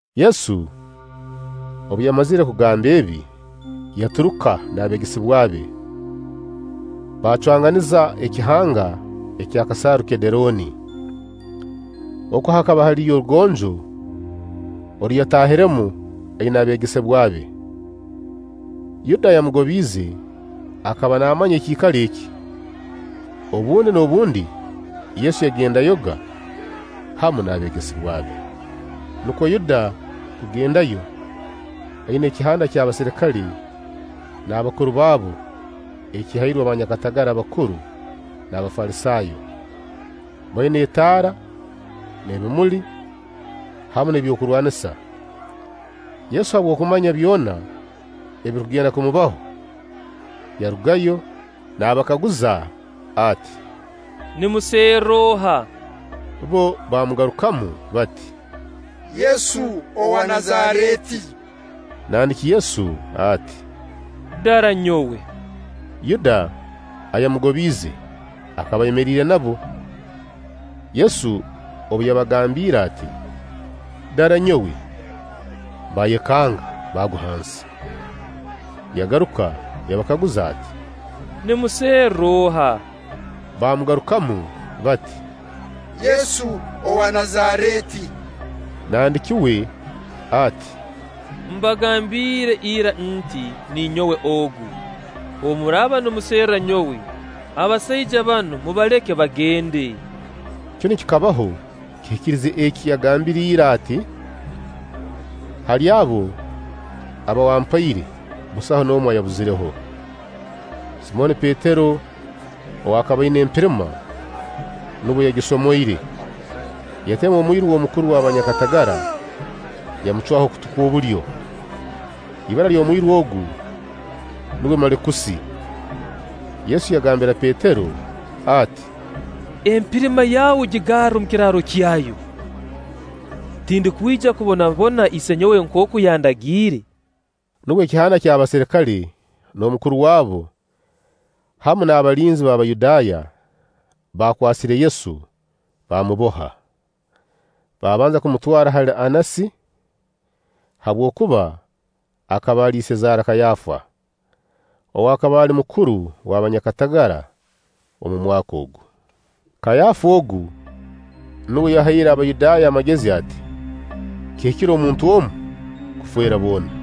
Yesu obu yamazire kugamba ebi, yaturuka n'abeegesebwa be baacwanganiza ekihanga eky'akasaaru Kederooni. Oku hakaba haliyo orugonjo oru yataahiremu aina abeegesebwa be. Yuda, ayamugobiize, akaba naamanya ekiikaro eki. Obundi n'obundi Yesu yagendayoga hamu n'abeegesebwa be. Nukwo Yuda kugendayo aina ekihanda ky'abaserikale n'abakuru baabo eki yahairwe banyakatagara abakuru n'Abafalisaayo, baina etaara n'ebimuli, hamu n'eby'okurwanisa. Yesu habw'okumanya byona ebirukugenda kumubaho, yarugayo naabakaguza ati: “Nimuserra oha?” Bbo baamugarukamu bati: “Yesu owa Nazareeti.” Nandiki Yesu ati: “Dara nyowe.” Yuda, ayamugobiize, akaba ayemeriire nabo. Yesu obu yabagambiire ati: “Dara nyowe”, baayekanga, baagwa hansi. Yagaruka yabakaguza ati: “Nimuserra oha?” Baamugarukamu bati: “Yesu owa Nazareeti.” Nandiki uwe ati: “Mbagambiire ira nti; Ninyowe ogu. Obu muraaba nimuserra nyowe, abasaija banu mubaleke bagende.” Kinu kikabaho kiikirize eki yagambire ira ati: “Hali abo aba wampaire, busaho n'omu ayabuzireho.” Simooni Petero ow'akaba aina empirima, nubwo yagisomoire, yatema omwiru w'omukuru w'abanyakatagara, yamucwaho okutu kw'obulyo. Ibara ly'omwiru ogu, nuwe Malikusi. Yesu yagambira Petero ati: “Empirima yawe gigarre omu kiraaro kyayo; tindukwija kubonabona Isenyowe nkooku yandagiire?” Nubwo ekihanda ky'abaserikale n'omukuru waabo hamu n'abalinzi b'Abayudaaya baakwasire Yesu baamuboha. Baabanza kumutwara hali Annasi, habwokuba akaba ali isezaara Kaayafa, ow'akaba ali mukuru w'abanyakatagara omu mwaka ogu. Kaayafa ogu, nuwe yahaire Abayudaaya amagezi ati: Kihikire omuntu omu kufeera boona.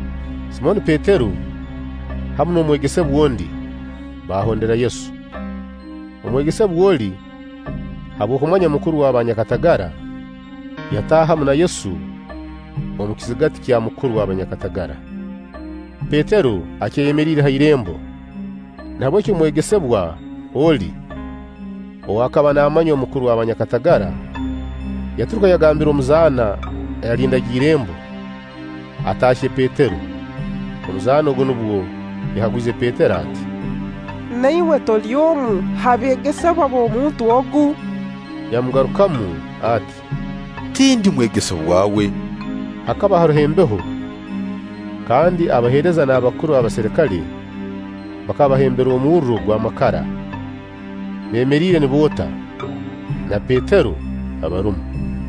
Simooni Petero hamu n'omwegesebwa ondi, baahondera Yesu. Omwegesebwa oli, habw'okumanywa mukuru w'abanyakatagara, yataaha hamu na Yesu omu kizigati kya mukuru w'abanyakatagara; Petero akyayemeriire ha irembo. Nahabweki omwegesebwa oli, ow'akaba naamanywa mukuru w'abanyakatagara, yaturuka, yagambira omuzaana ayalindaga irembo, ataahye Petero. Omuzaana ogu nubwo yakagwize Petero ati: “Na iwe toli omu ha beegesebwa b'omuntu ogu?” Yamugarukamu ati: “Tindi mwegesebwa we.” Hakaba haroho embeho kandi abaheereza n'abakuru b'abaserikale bakaba bahembere omurro gw'amakara, beemeriire niboota, na Petero abarumu.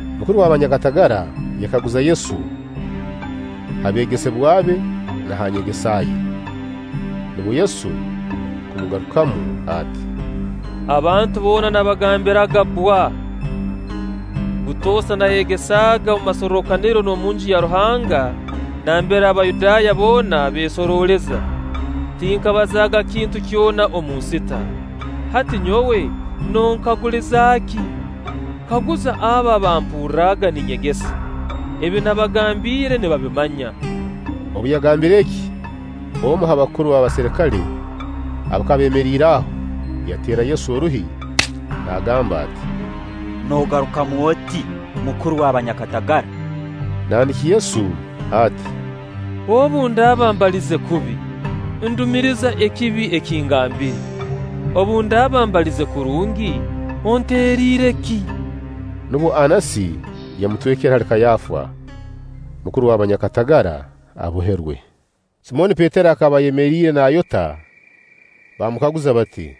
Mukuru w'abanyakatagara yakaguza Yesu ha beegesebwa be na ha nyegesa ye. Nukwo Yesu kumugarukamu ati: “Abantu boona nabagambiraga bbwa. Butoosa naayegesaaga omu masorrokaniro n'omunju ya Ruhanga, nambere Abayudaaya boona beesorooleza. Tinkabazaaga kintu kyona omunsita. Hati nyowe nonkaguliza ki? Kaguza abo abaampurraga ninyegesa; ebi nabagambiire nibabimanya.” Obu yagambire eki, omu ha bakuru b'abaserikale abakaba beemeriire aho, yateera Yesu oruhi naagamba ati: “Noogarukamu oti mukuru w'abanyakatagara?” Nandiki Yesu ati: “Obu ndaaba mbalize kubi, ndumiriza ekibi eki ngambire. Obu ndaaba mbalize kurungi, onteeriire ki?” Nubwo Annasi yamutwekere hali Kaayafa, mukuru w'abanyakatagara aboherwe. Simooni Petero akaba ayemeriire naayota. Baamukaguza bati: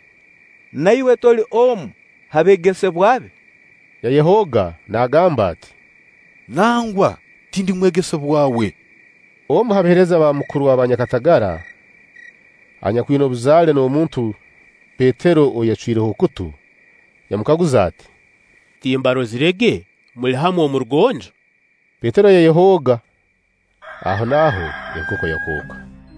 “Na iwe toli omu ha beegesebwa be?” Yayehooga naagamba ati: “Nangwa, tindi mwegesebwa we.” Omu ha baheereza ba mukuru w'abanyakatagara, anyakwina obuzaale n'omuntu Petero ou yacwireho okutu, yamukaguza ati: “Timbarozirege muli hamu omu rugonjo?” Petero yayehooga; ahonaaho enkoko yakooka.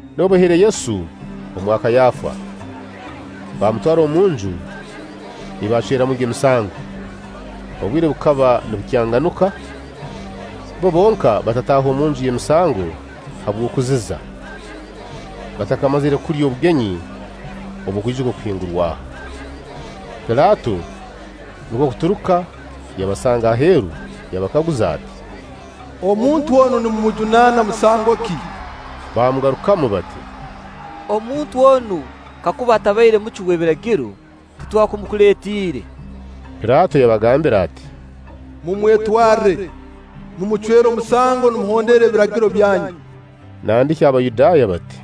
Nubwo baihire Yesu omwa Kaayafa, baamutwara omunju ei baacweramuga emisango. Obwire bukaba nibukyanganuka. Bbo bonka batataahe omunju y'emisango habw'okuziza, batakamazire kulya obugenyi obw'okwijuka Okuhingurwaho. Pilaato nukwo kuturuka yabasanga aheeru, yabakaguza ati: “Omuntu onu nimumujunaana musango ki?” Baamugarukamu bati: “Omuntu onu kakuba atabaire mucwi w'Ebiragiro, titwakumukuleetiire.” Pilaato yabagambira ati: “Mumwetwarre, mumucwere omusango nimuhondera Ebiragiro byanyu.” Nandiki Abayudaaya bati: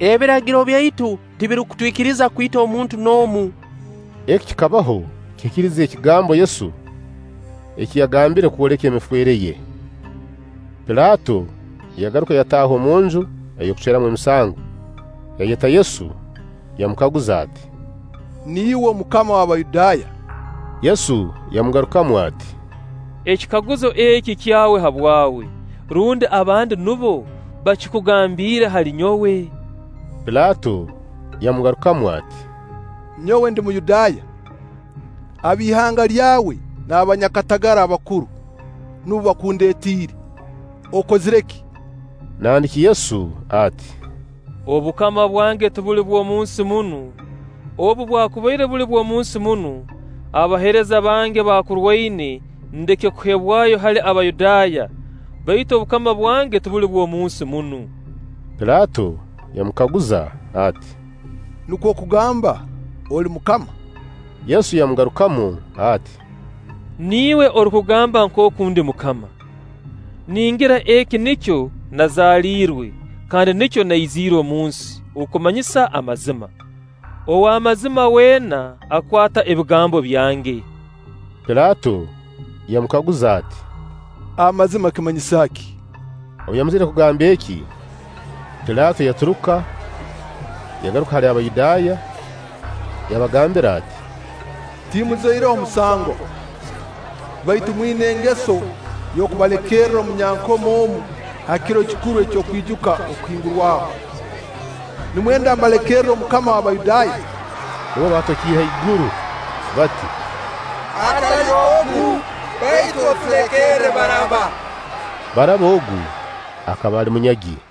“Ebiragiro byaitu tibirukutwikiriza kwita omuntu n'omu.” Eki kikabaho kihikirize ekigambo Yesu eki yagambire kwoleka emifeere ye. Pilaato yagaruka yataaha omunju ey'okucweramu emisango, yayeta Yesu yamukaguza ati: “Niiwe Mukama w'Abayudaaya?” Yesu yamugarukamu ati: “Ekikaguzo eki kyawe habwawe, rundi abandi nubo bakikugambiire hali nyowe?” Pilaato yamungarukamu ati: “Nyowe ndi Muyudaaya? Ab'ihanga lyawe n'abanyakatagara abakuru nubo bakundeetiire. Okozire ki?” Nandiki Yesu ati: “Obukama bwange tibuli bw'omunsi munu; obu bwakubaire buli bw'omunsi munu, abaheereza bange bakurwaine, ndeke kuheebwayo hali Abayudaaya; baitu obukama bwange tibuli bw'omunsi munu.” Pilaato yamukaguza ati: “Nukwo kugamba oli mukama?” Yesu yamugarukamu ati: “Niiwe orukugamba nkooku ndi mukama. Ningira eki nikyo nazaalirwe, kandi nikyo naiziire omunsi, okumanyisa amazima. Ow'amazima weena akwata ebigambo byange.” Pilaato yamukaguza ati: “Amazima kimanyisa ki?” Obu yamazire kugamba eki, Pilaato yaturuka, yagaruka hali Abayudaaya, yabagambira ati: “Timurozireho musango. Baitu mwina engeso y'okubalekerra omunyankomo omu ha kiro kikuru eky'okwijuka Okuhingurwaho. Nimwenda mbalekerre Omukama w'Abayudaaya?” Nubwo baatokiire haiguru bati: “Atali ogu, baitu otulekerre Baraaba!” Baaraba ogu akaba ali munyagi.